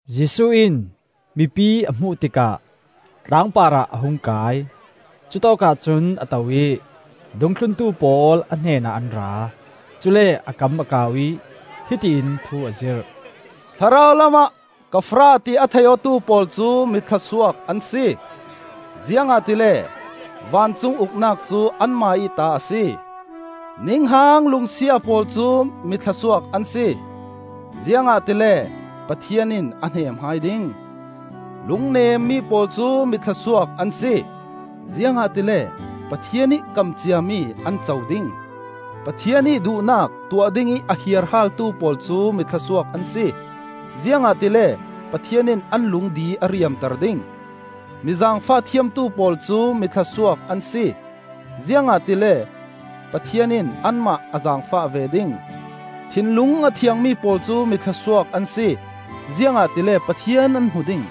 Jesuh in mipi a hmuh tikah tlangpar ah a hung kai; cutawkah cun a to ih a dungthluntu pawl a hnenah an ra. Cule a kam a kau ih hiti in thu a zirh: “Thlarau lamah ka farah ti a thei awtu pawl cu mi thluasuak an si; Ziangahtile vancung Uknak cu anmah ih ta a si. Ninghang lungsia pawl cu mi thluasuak an si; Ziangahtile Pathian in a hneem hai ding. Lungnemmi pawl cu mi thluasuak an si; Ziangahtile Pathian ih kam ciami an co ding. Pathian ih duhnak tuah dingih a hiarhaaltu pawl cu mi thluasuak an si; Ziangahtile Pathian in an lung di a riamter ding. Mi zaangfah thiamtu pawl cu mi thluasuak an si; Ziangahtile Pathian in anmah a zaangfah ve ding. Thinlung a thiangmi pawl cu mi thluasuak an si; Ziangahtile Pathian an hmu ding.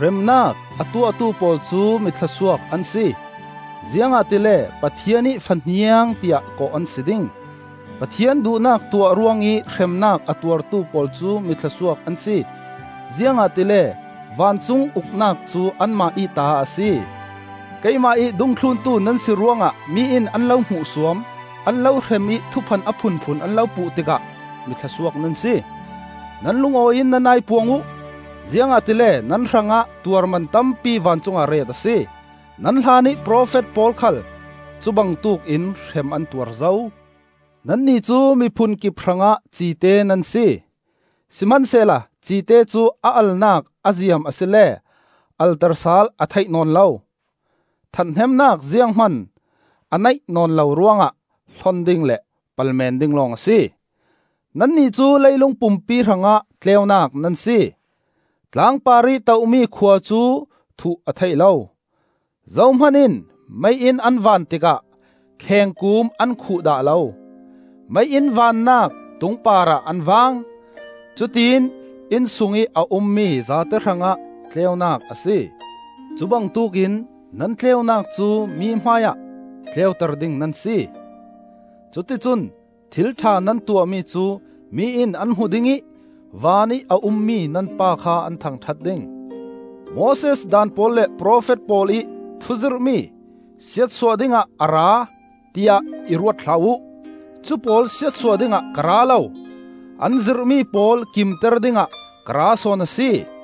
Remnak a tuahtu pawl cu mi thluasuak an si; Ziangahtile Pathian ih fahniang tiah kawh an si ding. Pathian duhnak tuah ruangih hremnak a tuartu pawl cu mi thluasuak an si; Ziangahtile vancung Uknak cu anmah ih ta a si. “Keimah ih dungthluntu nan si ruangah mi in an lo hmuhsuam, an lo hrem ih thuphan a phunphun an lo puh tikah mi thluasuak nan si. Nan lungawi in nan aipuang uh, ziangahtile nan hrangah tuarman tampi vancung ah ret a si. Nan hlanih profet pawl khal cu bangtuk in hrem an tuar zo. “Nannih cu mi phunkip hrangah cite nan si. Sihmansehla cite cu a alnak a ziam asile alter sal a theih nawn lo. Ṭhathnemnak zianghman a neih nawn lo ruangah hlon ding le pal men ding lawng a si. “Nannih cu leilung pumpi hrangah tleunak nan si. Tlangpar ih tohmi khua cu thuh a theih lo. Zohman in mei-inn an van tikah khengkuum an khuh dah lo. Mei-inn vannak tung parah an vang. Cutiin inn sungih a ummi zate hrangah tleunak a si. Cubangtuk in nan tleunak cu mi hmaiah tleuter ding nan si. Cuticun thil ṭha nan tuahmi cu mi in an hmu ding ih vanih a ummi nan Pa kha an thangṭhat ding. “Moses Daan pawl le profet pawl ih thuzirhmi siatsuah dingah a ra, tiah i ruat hlah uh. Cupawl siatsuah dingah ka ra lo, an zirhmi pawl kimter dingah ka ra sawn a si.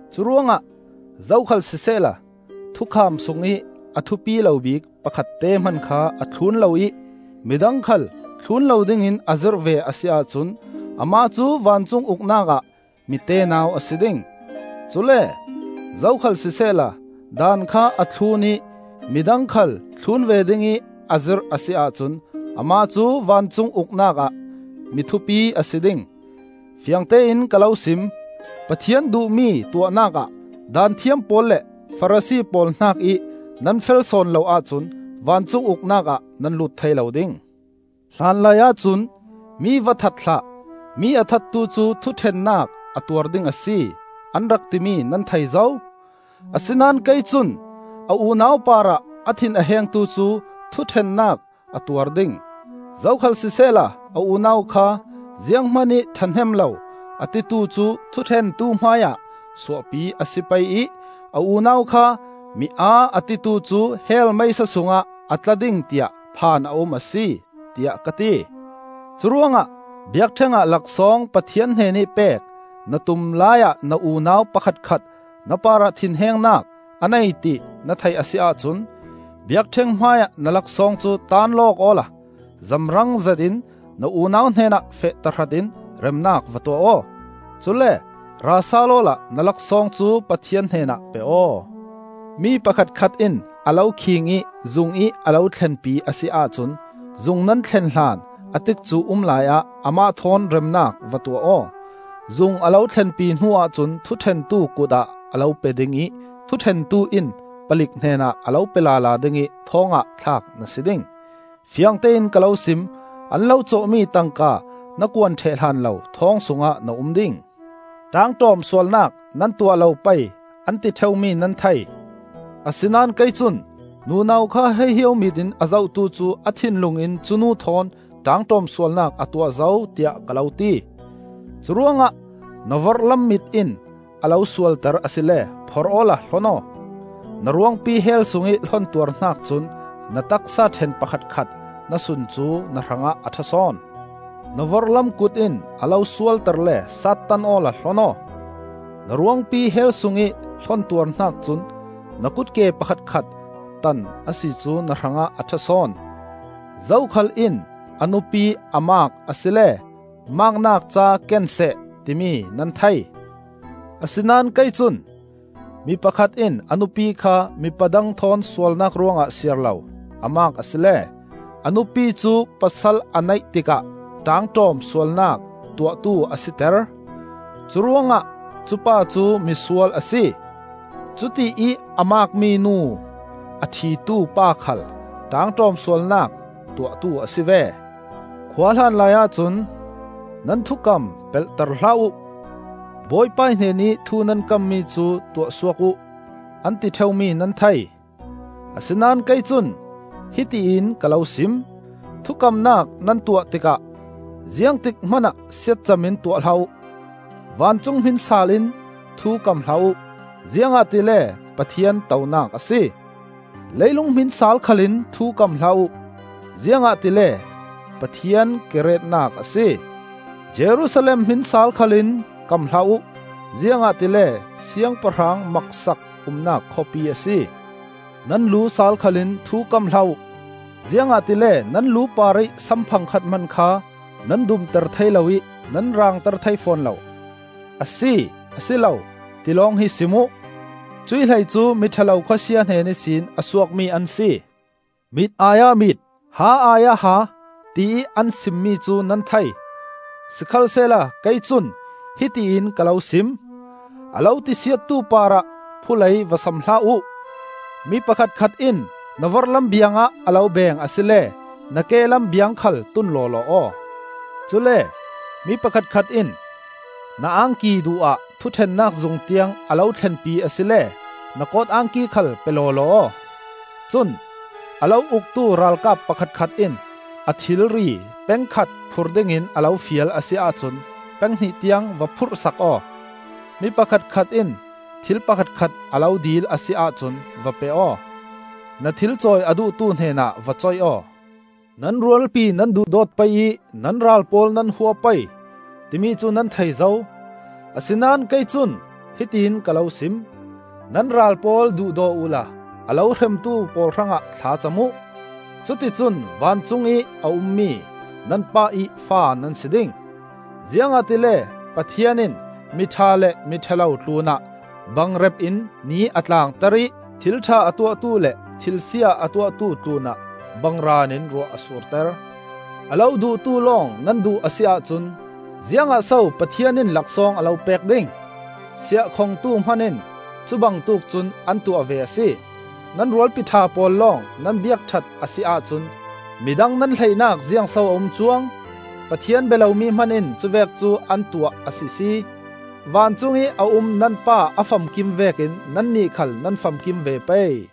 Curuangah zokhal sisehla thukham sungih a thupi lo bik pakhatte hman kha a thlun lo ih mi dang khal thlun lo dingin a zirh ve a si ahcun amah cu vancung Uknak ah mi tenau a si ding. Cule zokhal sisehla Daan kha a thlun ih mi dang khal thlun ve dingih a zirh a si ahcun amah cu vancung Uknak ah mi thupi a si ding. Fiangtein ka lo sim: Pathian duhmi tuahnak ah Daanthiam pawl le Farasi pawl hnakih nan fel sawn lo ahcun vancung Uknak ah nan lut thei lo ding. “Hlanlaiah cun ‘Mi va that hlah, mi a thattu cu thuṭhennak a tuar ding a si,’ an rak timi nan thei zo. Asinain kei cun: a unau parah a thin a hengtu cu thuṭhennak a tuar ding; zokhal sisehla a unau kha ‘Zianghman ih ṭhahnem lo,’ a titu cu thuṭhentu hmaiah suahpi a si pei ih a unau kha, ‘Mi aa,’ a titu cu hell meisa sungah a tla ding tiah phan a um a si, tiah ka ti. Curuangah biakṭheng ah laksawng Pathian hnenih pek na tum laiah na unau pakhatkhat na parah thinhengnak a nei ti na thei a si ahcun, biakṭheng hmaiah na laksawng cu taanlawk awla zamrang zetin na unau hnenah feh tahratin remnak va tuah aw; cule ra sal awla na laksawng cu Pathian hnen ah pe aw. “Mi pakhatkhat in a lo khiing ih zungih a lo thlenpi a si ahcun, zung nan thlen hlan a tikcu um laiah amah thawn remnak va tuah aw. Zung a lo thlenpi hnuah cun thuṭhentu kut ah a lo pe ding ih thuṭhentu in palik hnenah a lo pe lala ding ih thawng ah thlak na si ding. Fiangtein ka lo sim: an lo cawhmi tangka na kuan ṭheh hlan lo thawng sungah na um ding. “Ṭaangṭawm sualnak nan tuah lo pei, an ti ṭheumi nan thei. Asinain kei cun: nunau kha hahio mit in a zohtu cu a thinlung in cu nu thawn ṭaangṭawm sualnak a tuah zo, tiah ka lo ti. Curuangah na vorhlam mit in a lo sualter asile phorh awla hlon aw. Na ruangpi hell sungih hlon tuar hnak cun na taksa ṭhen pakhatkhat na sun cu na hrangah a ṭha sawn. Na vorhlam kut in a lo sualter le sattan awla hlon aw. Na ruangpi hell sungih hlon tuar hnak cun na kutke pakhatkhat tan a si cu na hrangah a ṭha sawn. “Zokhal in a nupi a maak asile maaknak ca ken seh, timi nan thei. Asinain kei cun: mi pakhat in a nupi kha, mipa dang thawn sualnak ruangah siar lo, a maak asile, a nupi cu pasal a neih tikah ṭaangṭawm sualnak tuahtu a siter. Curuangah cupa cu mi sual a si. Cutiih a maak minu a ṭhitu pa khal ṭaangṭawm sualnak tuahtu a si ve. “Khuahlan laiah cun ‘Nan thukam pelhter hlah uh, Bawipa hnenih thu nan kammi cu tuah suak uh,’ an ti ṭheumi nan thei. Asinain kei cun hiti in ka lo sim: thukamnak nan tuah tikah ziangtik hmanah siatcam in tuah hlah uh. Vancung hmin saal in thu kam hlah uh, ziangahtile Pathian tonak a si. Leilung hmin saal khal in thu kam hlah uh, ziangahtile Pathian ke retnak a si. Jerusalem hmin saal khal in kam hlah uh, ziangahtile Siangpahrang maksak umnak khawpi a si. Nan lu saal khal in thu kam hlah uh, ziangahtile nan lu parih sam phangkhat hman kha nan dumter thei lo ih nan rangter thei fawn lo. ‘A si,’ ‘asilo,’ ti lawng hi sim uh; cuih hlei cu mi ṭha lo Khawsia hnen ihsin a suakmi an si. “Mit ai ah mit, ha ai ah ha, tiih an simmi cu nan thei. Sikhalsehla kei cun hiti in ka lo sim. A lo tisiattu parah phulei va sam hlah uh; mi pakhatkhat in na vorhlam biang ah a lo beeng asile na kehlam biang khal tun lawlaw aw. Cule mi pakhatkhat in na angki duh ah thuṭhennak zung tiang a lo thlenpi asile na kawt angki khal pe lawlaw aw. Cun a lo uktu ralkap pakhatkhat in a thilri peng khat phur dingin a lo fial a si ahcun peng hnih tiang va phurhsak aw. Mi pakhatkhat in thil pakhatkhat a lo dil a si ahcun va pe aw; na thil cawi a duhtu hnenah va coih aw. “Nan rualpi nan duhdawt pei ih nan ral pawl nan hua pei,” timi cu nan thei zo. Asinain kei cun hiti in ka lo sim: nan ral pawl duhdaw uhla a lo hremtu pawl hrangah thla cam uh; cuticun vancungih a ummi nan Pa ih fa nan si ding. Ziangahtile Pathian in mi ṭha le mi ṭha lo tlunah bangrep in ni a tlangter ih thil ṭha a tuahtu le thil sia a tuahtu tlunah bangraan in ruah a surter. A lo duhtu lawng nan duh a si ahcun ziangah so Pathian in laksawng a lo pek ding? Siahkhongtu hman in cu bangtuk cun an tuah ve a si! Nan rualpi ṭha pawl lawng nan biak ṭhat a si ahcun mi dang nan hleihnak ziangso a um cuang? Pathian bia lomi hman in cuvek cu an tuah a sisi! Vancung ih a um nan Pa a famkim vekin nannih khal nan famkim ve pei.